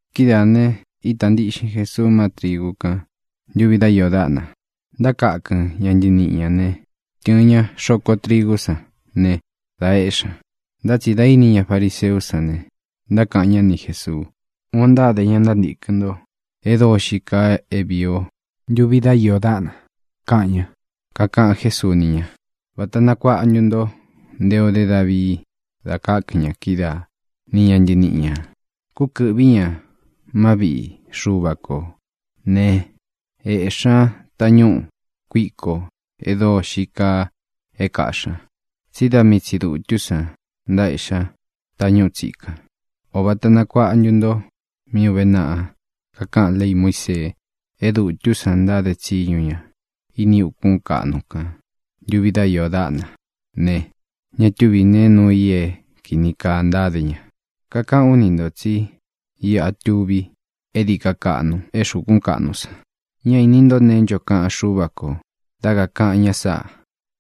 Kidáā ne, ítā ntiꞌxin Jesuu má trigu kán ntuvi dá iō dáꞌna. Ntákakɨn ña ntántīkɨn ñá ne, tɨ̄ɨn ña xoko trigú san ne, da éꞌxi ña. Ntá tsi dā íni ña fariseú san ne, ntákaꞌan ñá ni Jēsuu: —Uun ō ntáde ña ntántīkɨn nto é dóo xií kaa é vīi o ntuvi dá iō dáꞌna —kaꞌan ña. Kakaꞌan Jésuu ni ña: —¿Vāta nakuaꞌa ntu nto nte o dé Davii da kákɨn ña kídaa, ni ña ntɨniꞌi ñā? Kúkɨ̄ꞌví ña má viꞌi Xuva kō né, ēꞌxí ña tañúꞌu kuiko e dóo xií kaa é kaꞌxī ña, tsí da mii tsi dūtú san ntaéꞌxí ña tañúꞌu tsikan. ¿Ō vata nakuaꞌa ntu nto mí uve naꞌa kakaꞌan léi Muísee? É dūtú san ntáde tsiñu ña ini ukún kaꞌnu kān ntuvi dá iō dáꞌna ne, ña túvi nēe nuu i é kīni kaa ntáde ña. Kakaꞌán u ni ntō tsí iꞌa tuví e dií ka kaꞌnu é xukún kaꞌnu san. Ñá īni nto neé ncho kaꞌan Xúva kō dá kakāꞌan ña sáꞌā: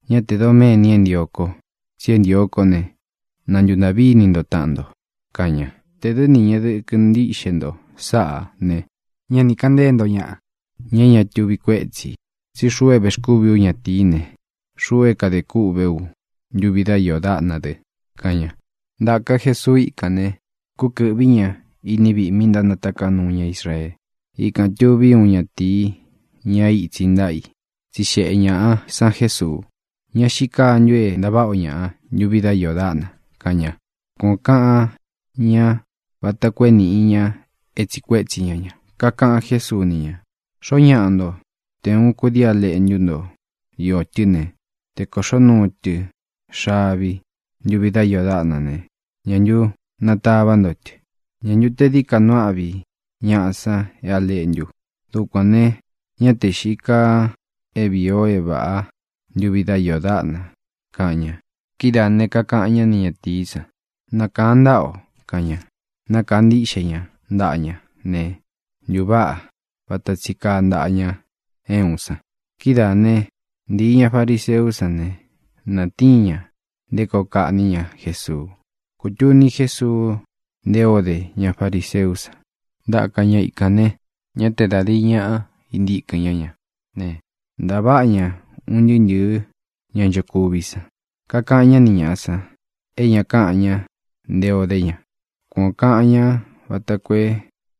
“Ñá tē doméni é ntio ko, tsi é ntio kó ne, na ntūntaꞌví ini nto taꞌan nto”, kaꞌan ña. Tē dɨ́ ni ñeꞌe dɨkɨ ntíꞌxe nto sáꞌā ne, ñá ni kāꞌan ntée nto ñaꞌa, ña é ña tuvi kuétsi ī. Tsí xuꞌu é vēxkúvi ú ñatīí ne, xuꞌu é kadē kûꞌvé u ntuvi dá iō dáꞌna dɨ —kaꞌan ña. Ntāka Jesuu íkān ne, kúkɨ̄ꞌví ña iní viꞌī mí ntánataká nuu ña Israee. Ikān tuví uun ñatīí, ña é itsi ntáꞌa i. Tsixeꞌe ñāꞌa san Jésuu: —¿Ña xíi kaa ntu é ntaváꞌa o ñaꞌa ntuvi dá iō dáꞌna? —kaꞌan ña. Kuan ō kaꞌan ñá vata koo é nīꞌi ña é tsiꞌi kuétsi ña ña. Kakaꞌan Jésuu ni ña: —Xoó ñaꞌa nto, te ūun kudii á leꞌntu nto īó tɨ ne, te kōꞌxó nuu tɨ xavi ntuvi dá iō dáꞌna ne, ¿ñā ntu natavá nto tɨ? ¿Ñā ntu te dií ka nuu áꞌvi ñaꞌa san é a leꞌntu? Dukuān ne, ñá te xīi kaa é vīi o é vāꞌá ntuvi dá iō dáꞌna —kaꞌan ña. Kidáā ne, kakaꞌan ñá ni ñatīí san: —Nakaan ntaꞌa o —kaꞌan ña. Nákaa ntiꞌxe ña ntaꞌa ña ne, ntuváꞌa vata tsi kaa ntaꞌa ña é uun san. Kidáā ne, ntíi ña fariseú san ne, natíin ña nté koo kaꞌní ña Jesuu. Kūtuni Jesuu nté ō dé ña fariseú san. Ntáka ña ikān ne, ñá te da dīi ñaꞌa intíkɨn ñá ña ne, ntaváꞌa ña un ntɨɨ́ ntɨ̄ɨ́ ña nchokuví san. Kakaꞌan ñá ni ñāꞌa san é ña káꞌan ña nte o dé ña. Kuan ō kaꞌan ñá vata koo é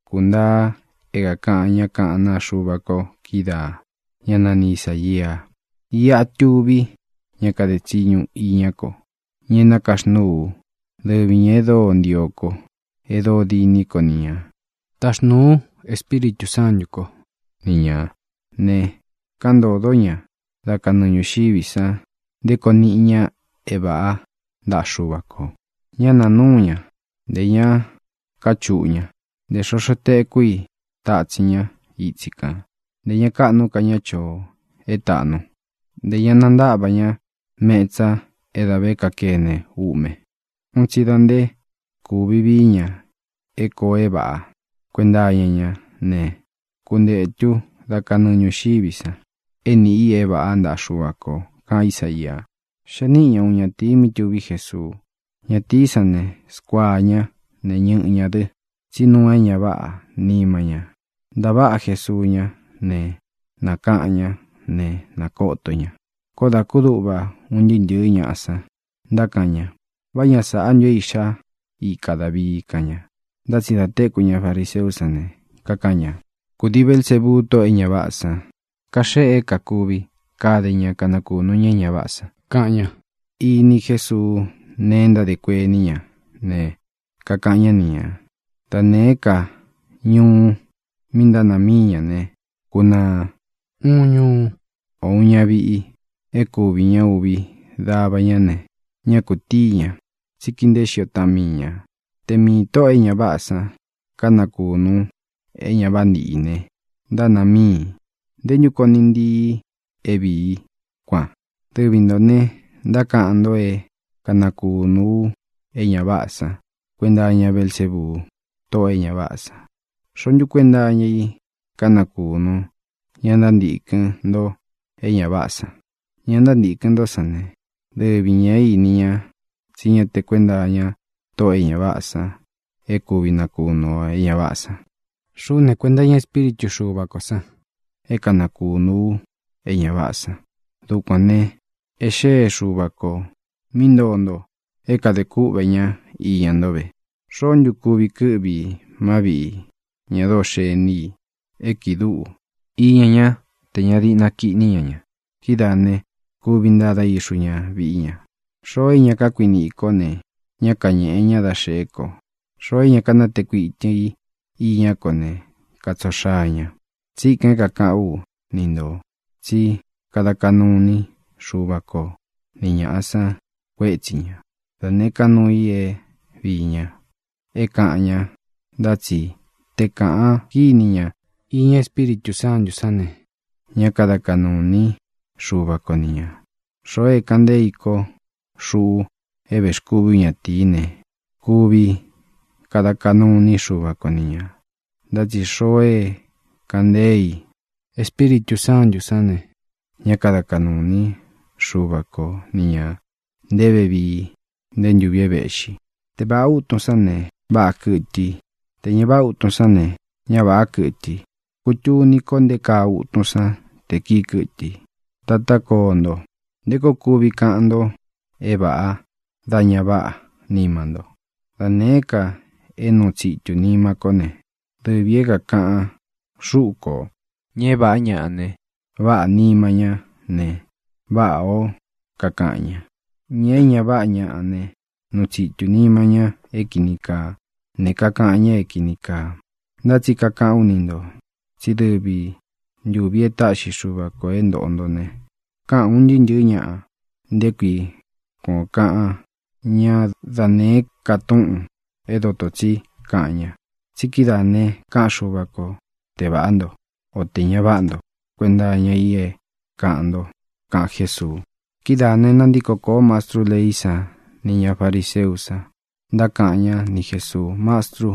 kūntaa é kākaꞌan ñá kaꞌán naa Xuva ko kídaā, ñá nani Isāia: Iꞌa tuví ña kade tsiñu iñá ko, ña e nákaxnúu ú, dɨvi ñā e dóo ntio ko, e dóo diní ko ni ñā. Taxnūu ú Espíritū Sántū kó ni ñā ne, kaꞌan ntódo ña dá kanɨɨ ñūxiví san nté koo niꞌi ña é vāꞌá ntaꞌa Xuva kō. Ñá nāa núu ña, ntē ña káchuꞌū ña. Ntē xoxo tekú i tátsin ña itsi kān. Ntē ña káꞌnu ka ña choo é tāꞌnu, ntē ña nantáꞌva ña metsa é dā vé kakene uꞌme un tsi da nté kūvi vií ña é kōo é vāꞌa. Kuenta iña ñá ne, kuntetu dá kanɨɨ ñūxiví san é niꞌi i é vāꞌá ntaꞌa Xuva kō, kaꞌan Ísaia. Xee níꞌi ña uun ñatīi mí tuví Jesuu. Ñatīí san ne, skuaa ña ne, ñɨꞌɨ ñā dɨ, tsí nuu é ña váꞌā nima ña. Ntaváꞌa Jesuu ñá ne, nakaꞌan ñá ne, nākoto ña. Koó dā kúduꞌva un ntɨɨ́ ntɨ̄ɨ́ ñaꞌa san, ntákaꞌan ña: —¿Vá ña sāꞌá ntu é iꞌxá ika Dāvii? —kaꞌan ña. Ntá tsi dā téku ña fariseú san ne, kaꞌan ña: —Kūdii Belsébuu, tóꞌō e ña váꞌā san, kaxéꞌe é kākuvi kade ña kanakunu ña é ña váꞌā san —kaꞌan ña. Ini Jésuu nee é ntádē kuení ña ne, kakaꞌan ñá ni ñā: —Da nēé ka ñuu mi ntánāa míi ñā ne, kunaa. Uun ñuú, ō uun ñaviꞌi é kuvi ña uvi dava ña ne, ñá kūtíi ña, tsí kīi nteé xio taꞌan mii ñā. Te miī tóꞌō e ña váꞌā san kanakūnu é ña váꞌa nīꞌi i ne, ntánāa míi i. ¿Nté ntu koo niꞌi ntii i é viī í, kuan? Dɨvi ntō ne, ntákaꞌan nto é kanakūnu u é ña váꞌā san kuenta iña Belsébuu, tóꞌō e ña váꞌā san. ¿Xoó ntu kuenta iña í kanakūnu ña ntántīkɨn nto é ña váꞌā san? Ña ntántīkɨn ntó san ne, dɨvi ñā é ini ña tsí ña te kuenta iña tóꞌō e ña váꞌā san é kūvi nakunu o é ña váꞌā san. Xuꞌú ne, kuenta iña Espíritu Xuva kō san é kanakūnu ú e ña váꞌā san. Dukuān ne, e xée Xuva kō mí ntoo nto é kadē kúꞌvē ñá iña nto ve. ʼ¿Xoó ntu kuvi kɨ́ꞌvi i má viꞌi ña dóo xení i é kiꞌi dúꞌu iña ñá tē ña diꞌna kiꞌní ña ña? Kidáā ne, kuvi ntada ixu ña viꞌi ña. ʼXoo é ña kákuiniꞌi ī kó ne, ñá kañēꞌe ñá da xeꞌé ko. Xoo é ña kánatee kuitɨn i iñá ko ne, katsoo xaa ña. ʼTsíkān é kākaꞌán u ni ntō tsí kada kaꞌnu iní Xuva ko ni ñāꞌa san kuétsi ña, da nēé ka nuu i é viī ña, é kāꞌan ña, ntá tsi te kāꞌan kíni ña iña Espíritū Sántū sán ne, ñá kada kaꞌnū iní Xuva ko ni ñā. Xoo é kāꞌan ntée i ko, xuꞌu é vēxkúvī ú ñatīí ne, kuvi kada kaꞌnu iní Xuva ko ni ñā, ntá tsi xoo é kāꞌan ntée i Espíritū Sántū sán ne, ñá kada kaꞌnū iní Xuva ko ni ñā nté vevii, nté ntūvi é vēꞌxi. ʼTe vāꞌá utun sán ne, váꞌā kɨtɨ i. Tē ña váꞌa ūtun sán ne, ña váꞌā kɨtɨ i. Kutuni ko nté kaa utun san te kīi kɨtɨ i. ¡Tatá koo nto! ¿Nté koo kuvi kaꞌan nto é vāꞌa dá ña váꞌā nima nto? Da nēé ka é nuu tsitu nima kó ne, dɨvī é kākaꞌan xúꞌu kō. Ña é vāꞌá ñaꞌa ne, váꞌā nima ñá ne, váꞌā ó kakaꞌan ña. Ña é ña váꞌa ñāꞌa ne, nuu tsitu nima ñá é kīni kaa, ne, kakaꞌan ñá é kīni kaa. Ntá tsi kakaꞌán u ni ntō, tsí dɨvi ntūvi é taꞌxi Xuva kō é ntōꞌo nto ne, káꞌān un ntɨɨ́ ntɨ̄ɨ́ ñaꞌa nté kui kuan ō kaꞌan ñá da nēé ka túꞌūn é dotō tsí kaꞌan ña. Tsi kídaā ne, káꞌan Xuva ko te vāꞌá nto, o tē ña váꞌa nto kuenta iña i é kāꞌan nto —kaꞌan Jésuu. Kidáā ne, nantíko kōó mastrú leí san nī ña fariseú san, ntákaꞌan ñá ni Jēsuu: —Mastrú,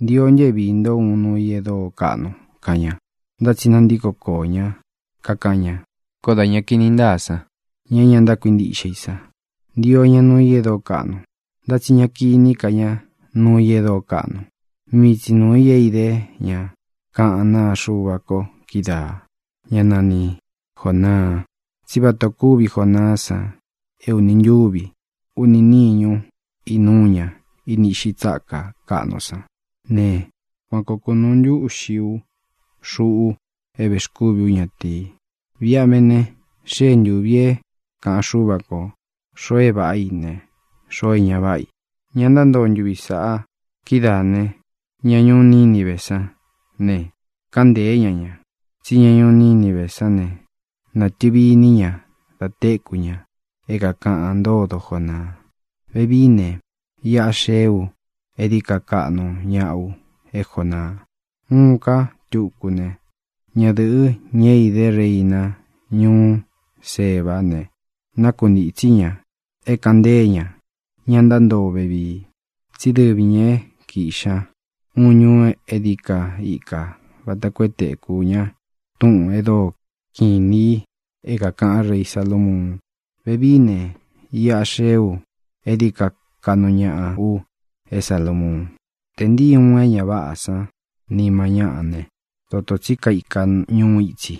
ntio ntɨ é viī ntó uun nuu i é dóo kaꞌnu —kaꞌan ña. Ntá tsi nantiko koó ña, kakaꞌan ña: —Koó da ña kini ntáa san, ña é ña ntákuintiꞌxe i san, ntio ña nuu i e dóo kaꞌnu. Ntá tsi ñá kīní ka ña nuu i e dóo kaꞌnu, mii tsī nuu i é idé ña kaꞌán naa Xuva ko kídaā, ñá nani Jōnaa. Tsí vata ō kúvi Jonaá san é uni ntúvi, uni níñu inúu ña ini iꞌxi tsáka kaꞌnu sán ne, kuan koo kunūu ntúꞌxi u, xuꞌu é vēxkúvi ú ñatīi. Viꞌi a vé ne, xée ntūvi é kāꞌan Xúva ko xōo e váꞌa i ne, xoo é ña váꞌa i, ña ntántoo ntuvi sāꞌa. Kidáā ne, ña ñuú Nínive san ne, káꞌan ntēé ña ña. Tsí ña ñuú Nínive sán ne, nātɨvi iní ña da téku ña é kākaꞌan ntódo Jonaa. Vevií ne, iꞌa xee ú e dií ka kaꞌnu ñaꞌa u é Jonaa. Uun ká tuku ne: Ñadɨ̄ꞌɨ, ñá é īdé reina ñuú Sebá ne, nákuntītsí ña é kāꞌan ntée ña ña ntántoo vevii. Tsí dɨvi ñā é kīꞌxi ña uun ñuú e dií ka ikā vata koo é tekū ña túꞌūn e dóo kiꞌin inī i, é kākaꞌan rei Salamuun. Vevií ne, iꞌa xee ú e dií ka kaꞌnu ñaꞌa u é Salamuun. ʼTe ntīí uun é ña váꞌā san nima ñáꞌa ne, dotō tsí kaika ñuú itsi,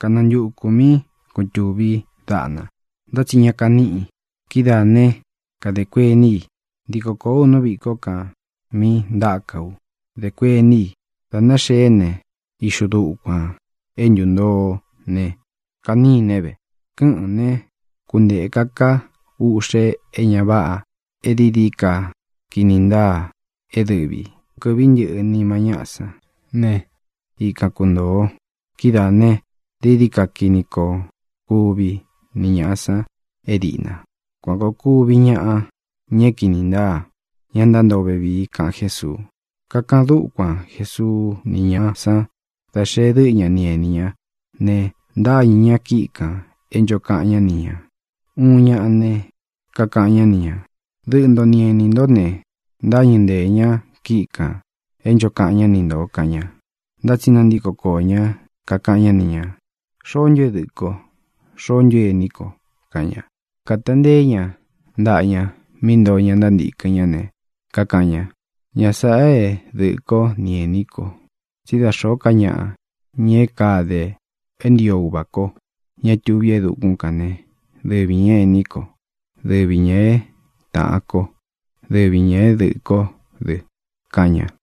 kanantukū míꞌi kūtuví daꞌna, ntá tsi ña kaníꞌi. Kidáā né, kadē kuení i: “Ntiko kōó u nú viꞌī kó kān mí ntáka u”, dé kuení i. Dā náxeé ne, ixu dukuān. É ntūntoo ne, kaníne ve. Kɨ́ꞌɨ̄n né, kuntēka ká uꞌxe é ña váꞌā e dií dií ka kini ntáā é dɨvī. Kɨ́ꞌvī ntɨꞌɨ nima ñáꞌa sán ne, ikan kuntōo. Kidáā ne, dií dií ka kini koo kuvi ni ñāꞌa san é dīꞌna. Kuan kōo kuvi ñaꞌa, ña é kīni ntáa, ña ntántoo vevii —kaꞌan Jésuu. Kakaꞌan dúkuan Jesuu ni ñáꞌa sán da xée dɨꞌɨ ña ni enī ñá ne, ntáñɨ̄ ña kíꞌi kān e ncho kaꞌan ñá ni ñā. Uun ñaꞌa ne, kakaꞌan ñá ni ñā: —Dɨꞌɨ nto ni enī ntó ne, ntáñɨ̄ ntée ña kíꞌi kān e ncho kaꞌan ñá ni ntō —kaꞌan ña. Ntá tsi nantíko koō ñá, kakaꞌan ñá ni ñā: —¿Xoó ntu é dɨꞌɨ̄ ko? ¿Xoó ntu é ení ko? —kaꞌan ña. Kāta nteé ña ntaꞌa ña mí ntoo ña ntántīkɨn ñá ne, kakaꞌan ña: —Ña sāꞌa é dɨꞌɨ̄ kó ni ēní ko. Tsí da xōó ka ñaꞌa, ña é kade é ntio Uvā kó, ña é tuví e dukún kān né, dɨvi ñā é ēní ko, dɨvi ñā é tāꞌan kó, dɨvi ñā é dɨꞌɨ̄ kó dɨ —kaꞌan ña.